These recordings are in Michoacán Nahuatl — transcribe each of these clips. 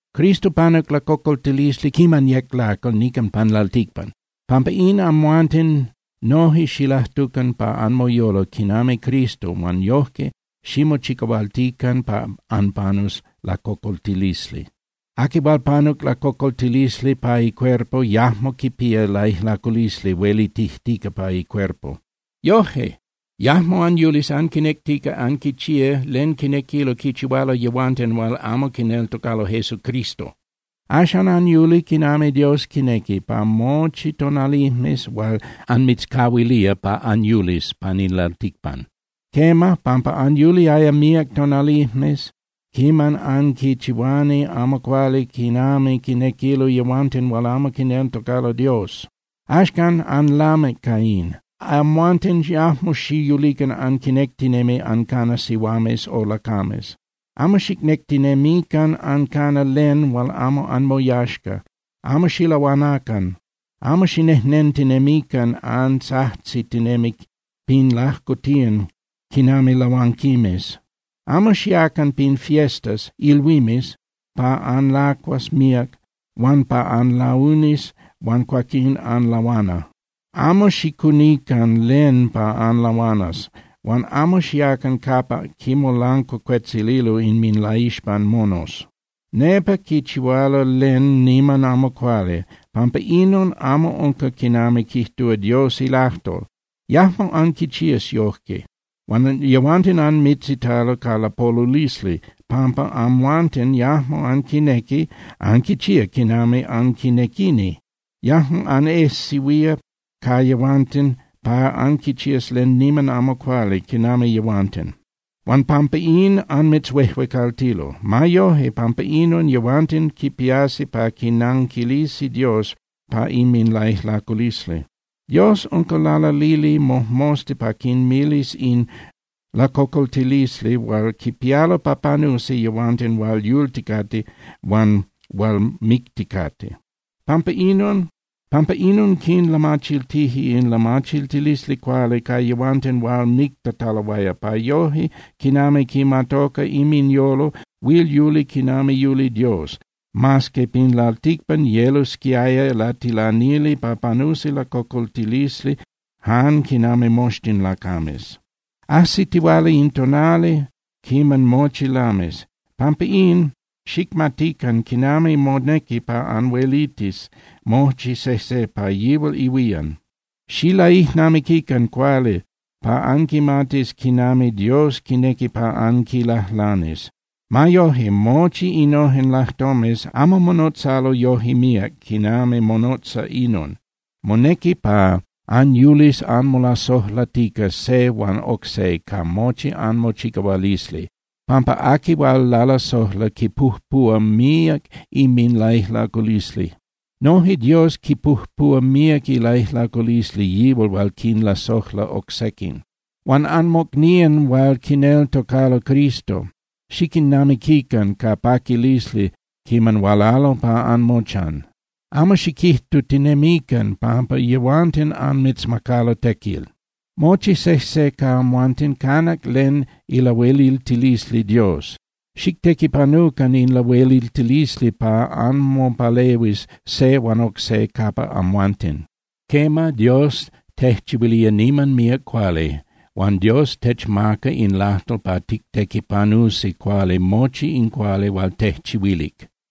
Cristo panuc lacocoltilisli quiman yec lacal nican pan lalticpan. Pampa in, amhuanten noje xilajtucan pa anmoyolo quinami Cristo huan yojque ximochicahualtican pa anpanus lacocoltilisli. Aqui hual panuc lacocoltilisli pa icuerpo yajmo quipía laijlaculisli huelitijtica pa icuerpo. Yoje, yajmo anyulis anquinectica anquichía len quinequilo quichihualo yehuanten hual amo quineltocalo Jesucristo. Axan anyuli quinami Dios quinequi, pa mochi tonalijmes hual anmitzcahuilía pa anyulis pan in lalticpan. Quema, pampa anyuliaya míac tonalijmes quiman anquichihuani amo cuali quinami quinequilo yehuanten hual amo quineltocalo Dios. Axcan, anlamic ca in. Amhuanten yajmo xiyulican anquinectinemi ancana sihuames o lacames. Amo xicnectinemican ancana len hual amo anmoyaxca. Amo xilahuanacan, amo xinejnentinemican antzajtzitinemi pin lajcotiyan quinami lahuanquimes. Amo xiacan pin fiestas (ilhuimes) pa anlacuas míac huan pa anlaunis huan cuaquín anlahuana. Amo xicunican len pa anlahuanas huan amo xiacan capa quinmolancuacuetzililo inminlaixpan monos. Nepa quichihualo len niman amo cuali, pampa inon amo unca quinami quijtúa Dios ilajtol. Yajmo anquichías yojque. Huan yehuanten anmitzitalo ca lapolulisli pampa amhuanten yajmo anquinequi anquichía quinami anquinequini. Yajmo anejsehuía ca yehuanten pa anquichías len niman amo cuali quinami yehuanten. Huan pampa in anmitzhuejuecaltilo. Ma yoje, pampa inon, yehuanten quipiasi pa quinanquilisi Dios pa inminlaijlaculisli. Dios unca lalalili mojmosta pa quinmilis in lacocoltilisli hual quipialo pa panusi yehuanten hual yulticate huan hual micticate. Pampa inon, quinlamachiltije in lamachiltilisli cuali ca yehuanten hual mictataloaya, pa yoje quinami quimatoca inminyolo huil yuli quinami yuli Dios, mas que pin lalticpan yelosquiaya latilanili pa panusi lacocoltilisli jan quinami moxtin lacames. Ajsitihuala in tonali quiman mochi lamis. Pampa in, xicmatican quinami monequi pa anhuelitis mochi sejse pa yihual ihuían. Xilaijnamiquican cuali pa anquimatis quinami Dios quinequi pa anquilajlanis. Ma yoje, mochi innojen lajtomes amo monotzalo yoje míac quinami monotza inon: Monequi pa anyulis anmolasojlatica se huan oc se ca mochi anmochicahualisli, pampa aqui hual lalasojla quipujpuhua míac inminlaijlaculisli. Noje Dios quipujpuhua míac ilaijlaculisli yihual hual quinlasojla oc sequin. Huan anmocnían hual quineltocalo Cristo, xiquinnamiquican ca paquilisli quiman hualalo pa anmochan. Amo xiquijtutinemican pampa yehuanten anmitzmacalo tequil. Mochi sejse ca amhuanten canac len ilahueliltilisli Dios. Xictequipanucan in lahueliltilisli pa anmopalehuis se huan oc se capa amhuanten. Quema, Dios tejchihuilía niman míac cuali, huan Dios techmaca in lajtol pa tictequipanusi cuali mochi in cuali hual tejchihuilic.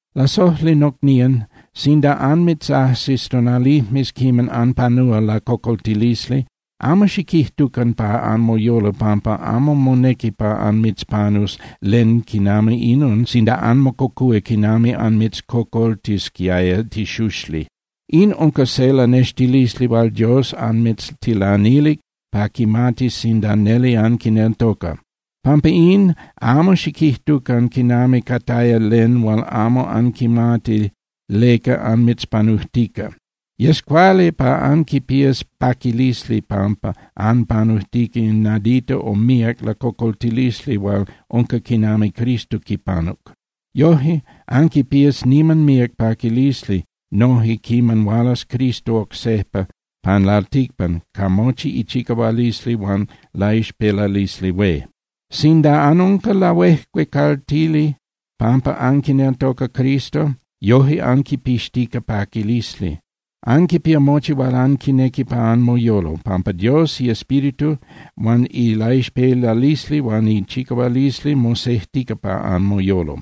Lasojli nocnían, sinda anmitzajsis tonalijmes quiman anpanúa lacocoltilisli, amo xiquijtucan pa anmoyolo pampa amo monequi pa anmitzpanus len quinami inon sinda anmococúa quinami anmitzcocoltisquiaya tixuxli. In unca se lanextilisli hual Dios anmitztilanilic pa quimatis sinda neli anquineltoca. Pampa in, amo xiquijtucan quinami cataya len hual amo anquimati leca anmitzpanujtica. Yes cuali pa anquipías paquilisli pampa anpanujtica in nadita o míac lacocoltilisli hual unca quinami Cristo quipanuc. Yoje, anquipías niman míac paquilisli noje quiman hualas Cristo oc sejpa pan lalticpan ca mochi ichicahualisli huan laixpelalisli hué. Sinda anunca lahuejuecaltili pampa anquineltoca Cristo, yoje anquipixtica paquilisli. Anquipía mochi hual anquinequi pa anmoyolo, pampa Dios iEspíritu huan ilaixpelalisli huan ichicahualisli mosejtica pa anmoyolo.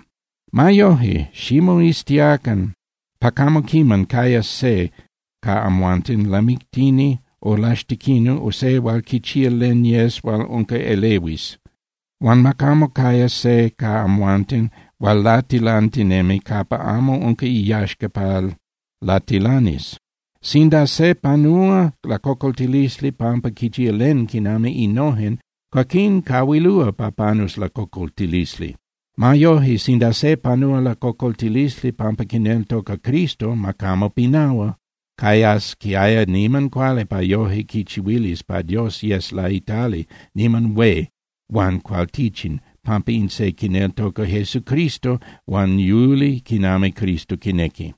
Ma yoje, ximoiztiacan pa camo quiman cayas se ca amhuanten lamictini o laxtequini o se hual quichía len yes hual unca elehuis. Huan ma camo caya se ca amhuanten hual latilantinemi capa amo unca iyaxca pa latilanis. Sinda se panúa lacocoltilisli pampa quichía len quinami innojen, cuaquín cahuilúa pa panus lacocoltilisli. Ma yoje, sinda se panúa lacocoltilisli pampa quineltoca Cristo, ma camo pinahua. Cayasquiaya niman cuali pa yoje quichihuilis pa Dios yes laitali niman hué huan cualtichin pampa in se quineltoca Jesucristo huan yuli quinami Cristo quinequi.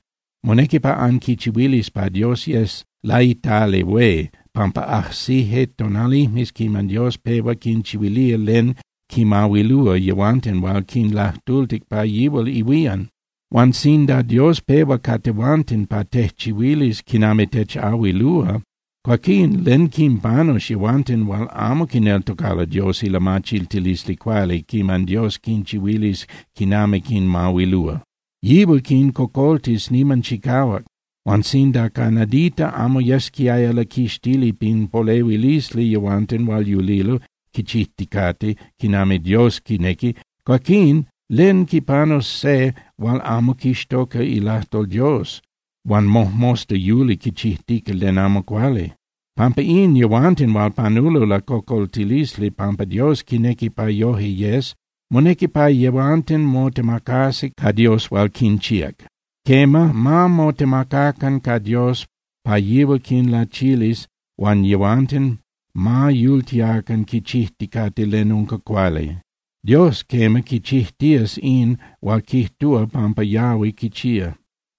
Monequi pa anquichihuilis pa Dios yes laitali hué pampa ajsije tonalijmes quiman Dios pehua quinchihuilía len quinmahuilúa yehuanten hual quinlajtultic pa yihual ihuían. Huan sinda Dios pehua ca tehuanten pa tejchihuilis quinami techahuilúa, cuaquín ¿len quinpanus yehuanten hual amo quineltocalo Dios ilamachiltilisli cuali quiman Dios quinchihuilis quinami quinmahuilúa? Yihual quincocoltis niman chicahuac. Huan sinda ca nadita amo yesquiaya laquixtili pin polehuilisli yehuanten hual yulilo quichijticate quinami Dios quinequi, cuaquín ¿len quipanus se hual amo quixtoca ilajtol Dios huan mojmosta yuli quichijtica len amo cuali? Pampa in, yehuanten hual panulo lacocoltilisli pampa Dios quinequi pa yoje yes, monequi pa yehuanten motemacasi ca Dios hual quinchíac. Quema, ma motemacacan ca Dios pa yihual quinlachilis huan yehuanten ma yultiacan quichijticate len unca cuali. Dios, quema, quichijtías in hual quijtúa pampa yahui quichía.